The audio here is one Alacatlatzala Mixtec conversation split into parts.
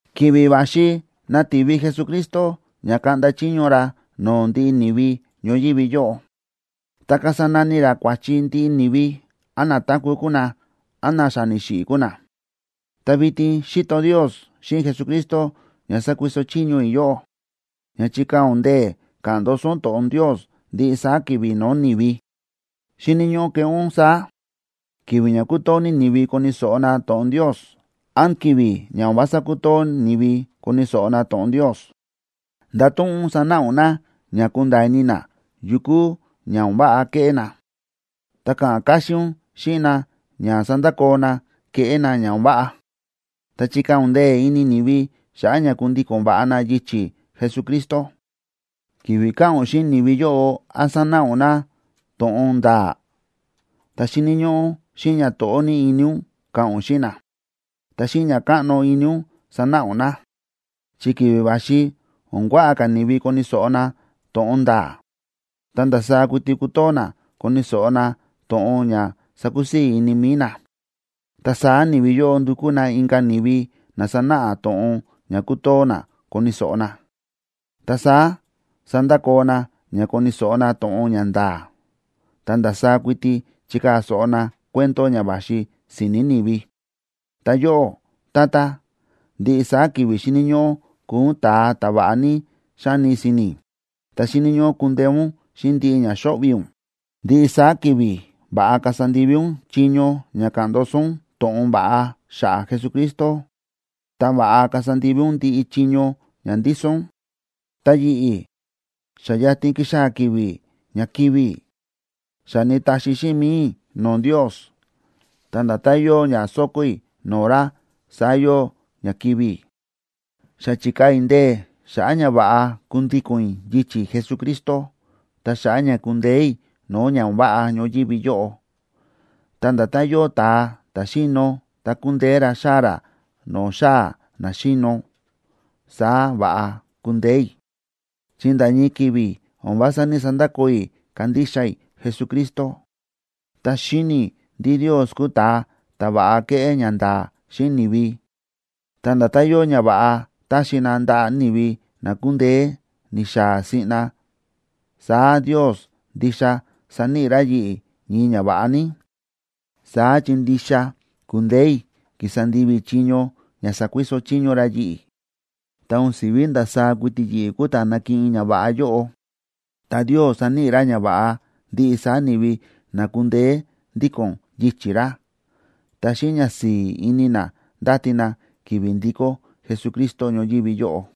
Ki̱vi̱ va̱xi nativi Jesucristo ña kaꞌnda chiño ra no̱o̱ ndiꞌi ni̱vi ñoyívi yóꞌo, ta kasa nani ra kua̱chi ndiꞌi ni̱vi, án na táku̱ kuu na, án na xa ni̱xiꞌi̱ kuu na. Ta vitin xíto Ndios xíꞌin Jesucristo ña sákuiso chiño i̱ yóꞌó ña chikaa̱ ún ndee̱ ka̱ꞌa̱n ndoso ún to̱ꞌon Ndios ndiꞌi saá ki̱vi̱ no̱o̱ ni̱vi. Xíni̱ ñóꞌó keꞌé ún saá, ki̱vi̱ ña kútoo ní ni̱vi koni̱ so̱ꞌo na to̱ꞌon Ndios, án ki̱vi̱ ña o̱n vása kútoo ni̱vi koni̱ so̱ꞌo na to̱ꞌon Ndios. Ndato̱ꞌon ún sanáꞌa ún na ña kunda̱a̱ ini na yu kúu ña o̱n váꞌa ke̱ꞌé na, ta ka̱ꞌa̱n káxín ún xíꞌin na ña sandakoo na kéꞌé na ña o̱n váꞌa. Ta chikaa̱ ún ndee̱ ini ni̱vi xa̱ꞌa̱ ña kundíko̱n va̱ꞌa na yichi̱ Jesucristo. Ki̱vi̱ ka̱ꞌa̱n ún xíꞌin ni̱vi yóꞌo án sanáꞌa ún na to̱ꞌon nda̱a̱, ta xíni̱ ñóꞌó xíꞌin ñato̱ꞌó ní ini ún ka̱ꞌa̱n ún xíꞌin na, ta xíꞌin ña káꞌno ini ún sanáꞌa ún na. Chi ki̱vi̱ va̱xi o̱n kuaꞌa ka̱ ni̱vi koni̱ so̱ꞌo na to̱ꞌon nda̱a̱, ta ndasaá kuiti kutoo na koni̱ so̱ꞌo na to̱ꞌon ña sakusii̱ ini mi̱i na. Ta saá ni̱vi yóꞌo ndúkú na inka̱ ni̱vi na sanáꞌa na to̱ꞌon ña kútoo na koni̱ so̱ꞌo na. Ta saá sandakoo na ña koni̱ so̱ꞌo na to̱ꞌon ña nda̱a̱, ta ndasaá kuiti chikaa̱ so̱ꞌo na cuento ña va̱xi si̱ni̱ ni̱vi. Ta yóꞌó, tata, ndiꞌi saá ki̱vi̱ xíni̱ ñóꞌó kuu ún ta̱a ta̱ va̱ꞌa ní xáni si̱ni̱, ta xíni̱ ñóꞌó kundeé ún xíꞌin ndiꞌi ña xo̱ꞌvi̱ ún. Ndiꞌi saá ki̱vi̱ va̱ꞌa kasa ndivi ún chiño ña ka̱ꞌa̱n ndoso ún to̱ꞌon va̱ꞌa xa̱ꞌa̱ Jesucristo, ta va̱ꞌa kasa ndivi ún ndiꞌi chiño ña ndíso ún. Ta yi̱ꞌi̱, xa yatin kixaa̱ ki̱vi̱ ña kivi̱ i̱. Xa ni̱taxi xíꞌin mi̱i i̱ no̱o̱ Ndios, ta nda̱tán yóo ña sóko̱ i̱ no̱o̱ ra, saá yóo ña kivi̱ i̱. Xa chi̱kaa̱ i̱ ndee̱ i̱ xa̱ꞌa̱ ña va̱ꞌa kundíko̱n i̱ yichi̱ Jesucristo ta xa̱ꞌa̱ ña kundeé i̱ no̱o̱ ña o̱n váꞌa ñoyívi yóꞌo. Ta nda̱tán yóo ta̱a ta̱ xíno ta ku̱ndeé ra xaa̱ ra no̱o̱ xáa̱ na xíno, saá va̱ꞌa ku̱ndeé i̱. Chi nda̱ ñii ki̱vi̱ o̱n vása ní‑sandakoo i̱ kándixa i̱ Jesucristo. Ta xíni̱ i̱ ndí Ndios kúu ta̱a ta̱ va̱ꞌa kéꞌé ñanda̱a̱ xíꞌin ni̱vi. Ta nda̱tán yóo ñava̱ꞌa táxi na ndaꞌa̱ ni̱vi na ku̱ndeé ni̱xaa̱ siꞌna, saá Ndios ndixa saníꞌi ra yi̱ꞌi̱ ñii ñava̱ꞌa ní, saá chi ndixa ku̱ndeé i̱ ki̱sa ndivi i̱ chiño ña sa̱kuiso chiño ra yi̱ꞌi̱. Ta o̱n si̱ví ndasaá kuiti yi̱ꞌi̱ kúu ta̱ nakiꞌin ñava̱ꞌa yóꞌo, ta Ndios saníꞌi ra ñava̱ꞌa ndiꞌi saá ni̱vi na ku̱ndeé ndíko̱n yichi̱ ra, ta xíꞌin ñasi̱i̱ ini na ndáti na ki̱vi̱ ndikó Jesucristo ñoyívi yóꞌo.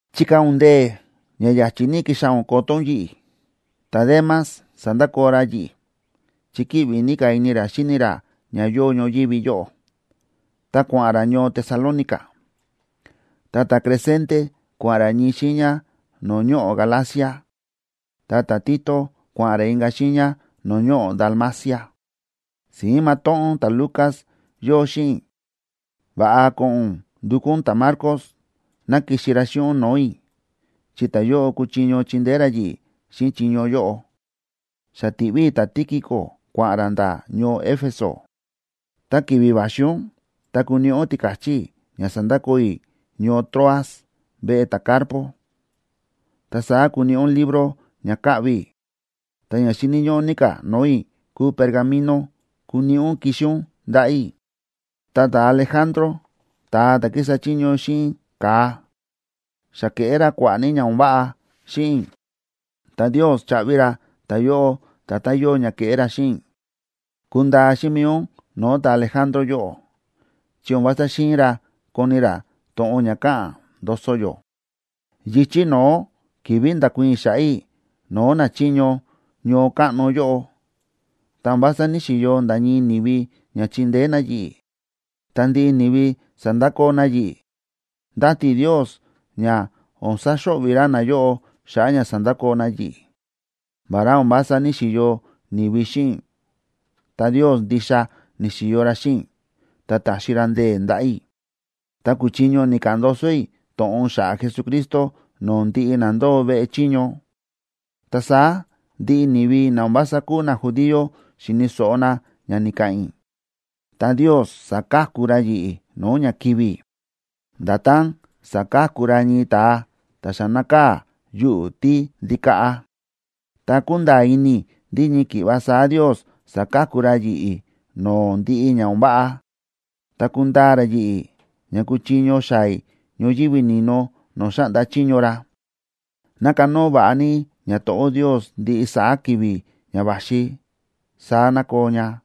Chikaa̱ ún ndee̱ ña ya̱chi̱ ní kixaa̱ ún koto ún yi̱ꞌi̱. Ta̱Demas sa̱ndakoo ra yi̱ꞌi̱, chi kíꞌvi ní ka̱ ini ra xíni ra ña yóo ñoyívi yóꞌo, ta kua̱ꞌa̱n ra ñoo Tesalónica. Ta ta̱Crescente kua̱ꞌa̱n ra ñii xiiña no̱o̱ ñoꞌo̱ Galacia, ta ta̱Tito, kua̱ꞌa̱n ra inka̱ xiiña no̱o̱ ñoꞌo̱ Dalmacia. Si̱ín matóꞌón ta̱Lucas yóo xíꞌin i̱. Va̱ꞌa ko̱ꞌo̱n ún ndukú ún ta̱Marcos ná kixi ra xíꞌin ún no̱o̱ i̱, chi ta̱yóꞌo kuchiño chindeé ra yi̱ꞌi̱ xíꞌin chiño yóꞌo. Xa ti̱ꞌví i̱ ta̱Tíquico kua̱ꞌa̱n ra nda̱ ñoo Éfeso. Ta ki̱vi̱ va̱xi ún, ta kuniꞌi ún tika̱chí i̱ ña sa̱ndakoo i̱ ñoo Troas veꞌe ta̱Carpo. Ta saá kuniꞌi ún libro ña kaꞌvi i̱, ta ña xíni̱ ñóꞌó ní ka̱ no̱o̱ i̱ kúu pergaminoa kuniꞌi ún kixi ún ndaꞌa̱ i̱. Ta ta̱Alejandro, ta̱a ta̱ kísa chiño xíꞌin ka̱a, xa ke̱ꞌé ra kua̱ꞌa̱ ní ña o̱n váꞌa xíꞌin i̱, ta Ndios chaꞌvi ra ta̱yóꞌo nda̱tán yóo ña ke̱ꞌé ra xíꞌin i̱. Kundaa xíꞌin mi̱i ún no̱o̱ ta̱Alejandro yóꞌo, chi o̱n vása xi̱in ra koni ra to̱ꞌon ña káꞌa̱n ndoso yó. Yichi̱ no̱ó ki̱vi̱ nda̱kuii̱n i̱ xa̱ꞌa̱ i̱ no̱o̱ nachiño ñoo káꞌno yóꞌo, ta o̱n vása ní‑xiyo nda̱ ñii ni̱vi ña chi̱ndeé na yi̱ꞌi̱, ta ndiꞌi ni̱vi sa̱ndakoo na yi̱ꞌi̱. Ndáti i̱ Ndios ña o̱n saxo̱ꞌvi̱ ra nayóꞌo xa̱ꞌa̱ ña sa̱ndakoo na yi̱ꞌi̱. Vará o̱n vása ní‑xiyo ni̱vi xíꞌin i̱, ta Ndios ndixa ni̱xi̱yo ra xíꞌin i̱, ta ta̱xi ra ndee̱ ndaꞌa̱ i̱. Ta ku̱chiño ni̱ka̱ꞌa̱n ndoso i̱ to̱ꞌon xa̱ꞌa̱ Jesucristo no̱o̱ ndiꞌi na ndóo veꞌe chiño, ta saá ndiꞌi ni̱vi na o̱n vása kúu najudío xi̱ni̱ so̱ꞌo na ña ni̱ka̱ꞌa̱n i̱. Ta Ndios sa̱ka̱ku ra yi̱ꞌi̱ no̱o̱ ña kivi̱ i̱, nda̱tán saka̱ku ra ñii ta̱a ta xa nákaa̱ yuꞌu̱ tíndikaꞌa. Ta kúnda̱a̱ ini i̱ ndí ñii ki̱ꞌva saá Ndios saka̱ku ra yi̱ꞌi̱ no̱o̱ ndiꞌi ña o̱n váꞌa, ta kundaa ra yi̱ꞌi̱, ña kuchiño xaa̱ i̱ ñoyívi ni̱no no̱o̱ xáꞌnda chiño ra. ¡Ná kanóo va̱ꞌa ní ñato̱ꞌó Ndios ndiꞌi saá ki̱vi̱ ña va̱xi! Saá ná koo ña.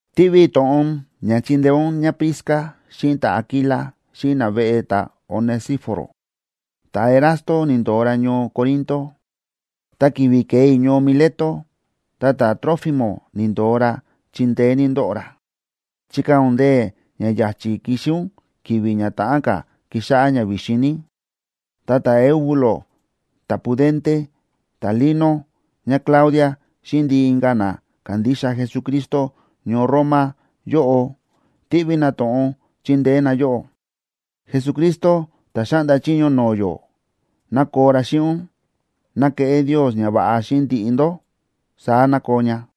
Tíꞌví i̱ to̱ꞌon ña chindeé ún ñáPrisca xíꞌin ta̱Aquila xíꞌin naveꞌe ta̱Onesíforo. Ta̱Erasto ni̱ndo̱o ra ñoo Corinto. Ta ki̱vi̱ ke̱e i̱ ñoo Mileto, ta ta̱Trófimo ni̱ndo̱o ra, chi ndeé ní ndóꞌo ra. Chikaa̱ ún ndee̱ ña ya̱chi̱ kixi ún ki̱vi̱ ña ta̱ꞌán ka̱ kixáꞌá ña vi̱xin ní. Ta ta̱Eubulo, ta̱Pudente, ta̱Lino, ñáClaudia xíꞌin ndiꞌi inka̱ na kándixa Jesucristo ñoo Roma yóꞌo tíꞌví na to̱ꞌon chindeé na yóꞌó. Jesucristo, ta̱ xáꞌnda chiño no̱o̱ yó, ná koo ra xíꞌin ún. Ná keꞌé Ndios ñava̱ꞌa xíꞌin ndiꞌi ndó. Saá ná koo ña.